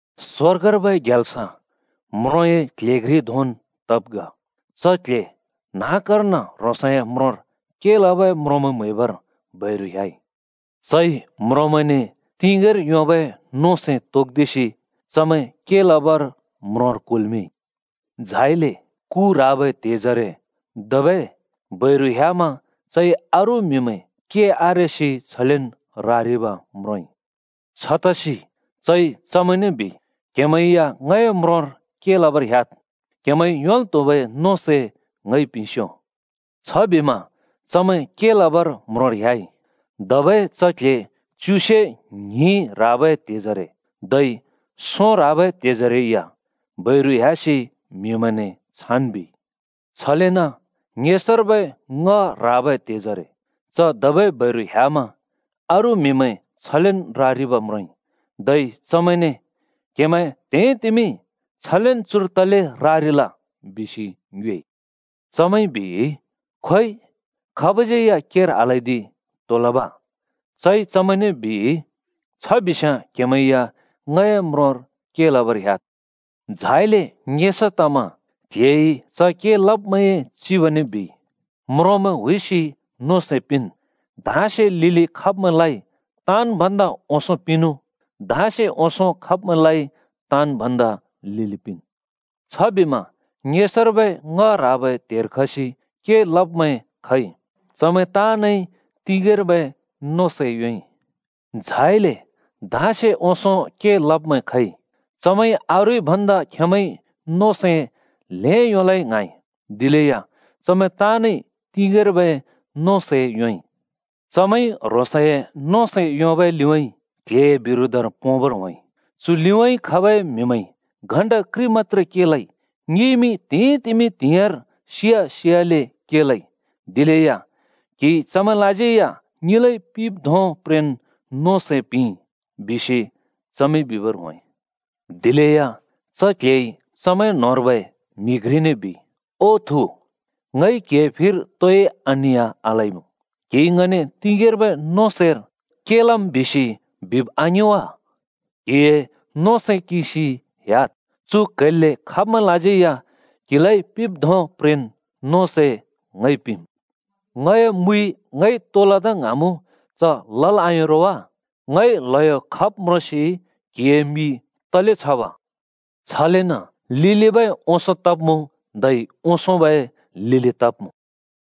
“स्‍वर्गर्बै ग्याल्स म्रोंए क्‍ल्‍हे घ्रि धोंन् तब् ग। च क्ल्हे न्‍हाँक्‍कर्न ह्रोंसए म्रोंर के लबै म्रोंमैं म्हैबर बैरु ह्‍याइ। चइ म्रोंमैंने तिगेंर योंबै नों सै तोक्दिसि चमैं के लबर म्रोंर कुल्‍मिंइ। “झाइले कु ह्राबै त्हेजरे धबै बैरु ह्‍यामा चइ अरू म्‍हिमैं के आरेसि छलेन् रारिब् म्रोंइ। छतसि चइ चमैंने बिइ, ‘क्‍हेमैं या ङए म्रोंर के लबर ह्‍याद्। क्‍हेमैंइ योंल् त्हुबै नों सै ङइ पिंस्‍यो।’ छबिमा चमैं के लबर म्रोंर ह्‍याइ। “धबै च क्‍ल्‍हे च्युसे ङ्हिं ह्राबै त्हेजरे धै सों ह्राबै त्हेजरे या बैरु ह्‍यासि म्‍हिमैंने छान् बिइ। छलेन ङेसर्बै ङ्‍ह ह्राबै त्हेजरे च धबै बैरु ह्‍यामा अरू म्‍हिमैं छलेन् रारिब् म्रोंइ। धै चमैंने, ‘क्हेमैं त्हिंइतिमि छलेन् चुर तले रारिल?’ बिसि ङ्योएइ। “चमैंइ बिइ, ‘खोइ, खाबज्यै या केर आल्‍हैदि। तो लब?’ “चइ चमैंने बिइ, ‘छ बिस्‍याँ क्‍हेमैं या ङए म्रोंर के लबर ह्‍याद्।’ “झाइले ङेसा तमा क्‍ल्‍हेइ के लब्मैंए चिबने बिइ, ‘म्रोंमैं हुइसि नों सै पिंन् धाँसे लिलि खब्‍मैंलाइ ताँन् भन्दा ओंसों पिंनु, धाँसे ओंसों खब्‍मैंलाइ ताँन् भन्दा लिलि पिंन्।’ छबिमा ङेसर्बै ङ्‍ह ह्राबै त्हेर खसि के लब्मैं खइ। चमैं ताँनइ तिंगेंर्बै नों सै योंइ। झाइले धाँसे ओंसों के लब्मैं खइ, चमैंइ अरूइ भन्दा खेंमैंइ नों सै ल्हें योंलै ङ्हाँइ। दिलेया चमैं ताँनइ तिंगेंर्बै नों सै योंइ। चमैंइ ह्रोंसए नों सै योंबै लिउँइँ क्‍ल्‍हेए बिरोधर पोंबर होंइ। ‘चु लिउँइँ खबै म्‍हिमैंइ घण्‍टा घ्रि मत्‍त्रे के लइ, ङिइमि त्‍हिंइतिमि त्‍हिंयाँर सिया सियाले के लइ। दिलेया क्‍हिइ चमैंलाज्यै या ङिलाइ पिंब् धों प्रेन् नों सै पिंइ,’ बिसि चमैंइ बिबर होंइ। “दिलेया च क्‍ल्‍हेइ चमैं न्‍होंर्बै म्‍हि घ्रिने बिइ, ‘ओ थु, ङइ क्‍हिए फिर तोइ अनिया आलइमुँ। क्‍हिइ ङने तिंगेंर्बै नों सैर के लम् बिसि बिब् आङिं वा? क्‍हिए नों सै किंसि ह्‍याद्। चु क्‍हैल्‍ले खब्‍मैंलाज्यै या क्‍हिलाइ पिंब् धों प्रेन् नों सै ङइ पिंम्। ङए मुइ ङइ तो लदा ङ्हाँमुँ च लल् आयों रो वा? ङइ ल्हयो खब् म्रोंसि क्‍हिए मि तले छब?’ “छलेन लिलिबै ओंसों तब्मुँ धै ओंसोंबै लिलि तब्‍मुँ।”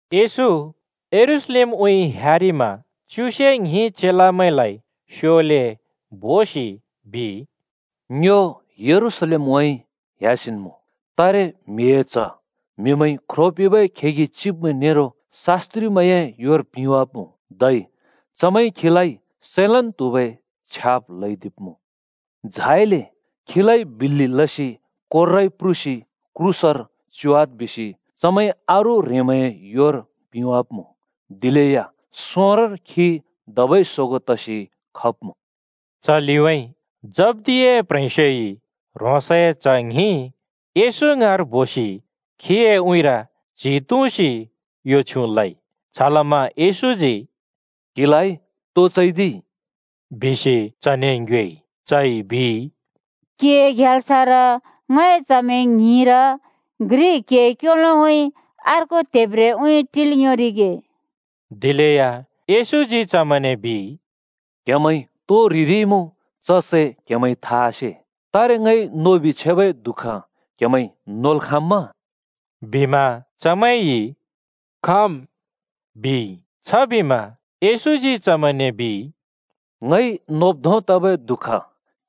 येशू यरूशलेमउँइँ ह्‍यारिमा च्युसे ङ्हिं चेलामैंलाइ स्योले बोसि बिइ, “ङ्यो यरूशलेमउँइँ ह्‍यासिन् मुँ। तारे म्हिए च्ह म्‍हिमैंइ ख्रो पिंबै खेगि चिब्मैं नेरो शास्‍त्रिमैंए योर पिंवाब्‍मुँ, धै चमैंइ खीलाइ सैलन् त्हुबै छ्याब् ल्हैदिब्मुँ। झाइले खीलाइ बिल्‍लि लसि कोर्राइ प्रुसि क्रूसर च्योवाद् बिसि चमैंइ अरू ह्रेंमैंए योर पिंवाब्‍मुँ, दिलेया सोंरोंर खी धबै सोगों तसि खब्‍मुँ।” च लिउँइँ जब्‍दियाए प्ह्रेंस्योइ ह्रोंसए च्‍ह ङ्हिं येशू ङाँर बोसि खीए उँइँर च्हि तुँसि यो छ्युँ लइ। छलमा येशूजी “क्‍हिलाइ तो चैदिइ?” बिसि चने ङ्योएइ। चइ बिइ, “क्‍हिए ग्याल्सर, ङए च्हमैं ङ्हिंर घ्रि क्हिए क्योलोउँइँ अर्को त्हेब्रेउँइँ टिल् योंरिगे।” दिलेया येशूजी चमैंने बिइ, “क्‍हेमैंइ तो ह्रिरिइमुँ च सै क्‍हेमैंइ था आसे। तारे ङइ नोबि छेबै दुःख क्‍हेमैंइ नोल् खाँम्‍मा?” बिमा चमैंइ “खाँम्,” बिइ। छबिमा येशूजी चमैंने बिइ, “ङइ नोब् धों तबै दुःख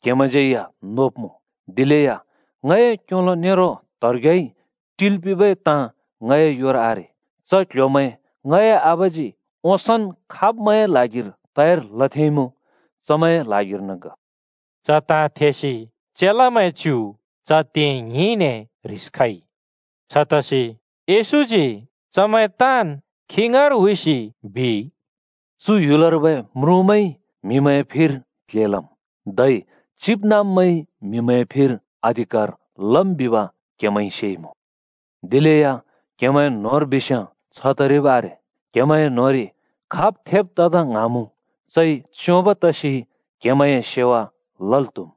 क्‍हेमैंज्यै या नोब्मुँ। दिलेया ङए क्‍योलो नेरो त्हेब्रेउँइँ टिल् पिंबै ताँ ङए योर आरे। च क्ल्ह्‍योमैं ङए आबाजी ओंसोंन् खाब्मैंए ल्हागिर तयार लथेंइमुँ चमैंए ल्हागिर्न ग।” चु ताँ थेसि चेलामैं च्‍यु च त्ये ङ्हिंने ह्रिस खइ। छतसि येशूजी चमैं ताँन् खी ङाँर हुइसि बिइ, “चु ह्‍युलर्बै म्रुँमैंइ म्हिमैंए फिर क्ल्हे लम्, धै चिबनाँब्मैंइ म्‍हिमैंए फिर अधिकार लम् बिब क्‍हेमैंइ सेइमुँ। दिलेया क्‍हेमैं न्‍होंर बिस्‍याँ छ तरिब् आरे। क्‍हेमैंए न्होंरि खाब् थेब तदा ङ्हाँमुँ, चइ च्योंब् तसि क्हेमैंए सेवा लल् त्‍हुम्।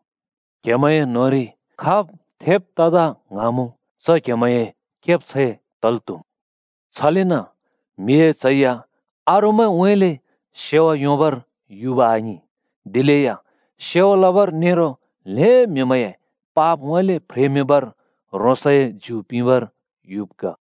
क्हेमैंए न्होंरि खाब् थेब तदा ङ्हाँमुँ च क्‍हेमैंए केब्छैं तल् त्‍हुम्। छलेन म्हिए च्ह या अरूमैंउँइँले सेवा योंबर युब आङिं, दिलेया सेवा लबर नेरो ल्‍हें म्‍हिमैंए पापउँइँले फ्रेमिंबर ह्रोंसए ज्यु पिंबर युब् ग।”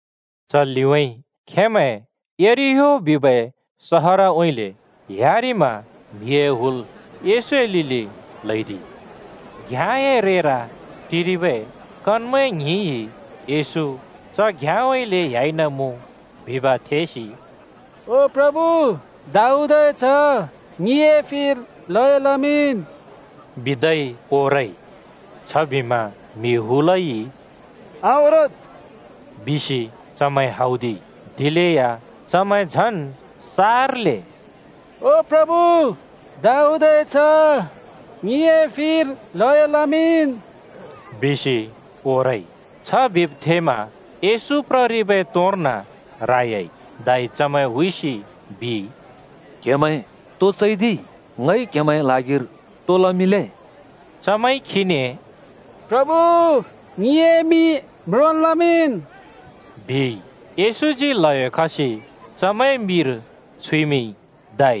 च लिउँइँ खेंमैं यरिहो बिबै सहरउँइँले ह्‍यारिमा म्हिए हुल येशूए लिलि ल्हैदिइ। घ्याँए रेर टिरिबै कनमैं ङ्हिंइ येशू च घ्‍याँउँइँले ह्‍याइनमुँ बिब् थेसि “ओ प्रभु, दाऊदए च्ह, ङिए फिर ल्हयो लमिंन् बिदै ओरइ।” छबिमा म्‍हि हुलइ “आओरद्!” बिसि चमैं हौदिइ, दिलेया चमैं झन् सार्ले “ओ प्रभु, दाऊदए च्ह, ङिए फिर ल्हयो लमिंन्,” बिसि ओरइ। छ बिब् थेमा येशू प्ररिबै तोर्न रायाइ धै चमैं हुइसि बिइ, “क्‍हेमैं तो चैदिइ? ङइ क्हेमैंए ल्हागिरि तो लमिंले?” चमैंइ खीने “प्रभु, ङिए मि म्रोंन् लमिंन्,” बिइ। येशूजी ल्‍हयो खसि चमैंए मिर छुइमिंइ धै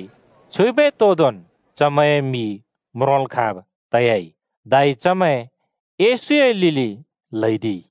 छुइबै तोदोंन् चमैंए मि म्रोंल् खाँब् तयाइ धै चमैं येशूए लिलि ल्‍हैदिइ।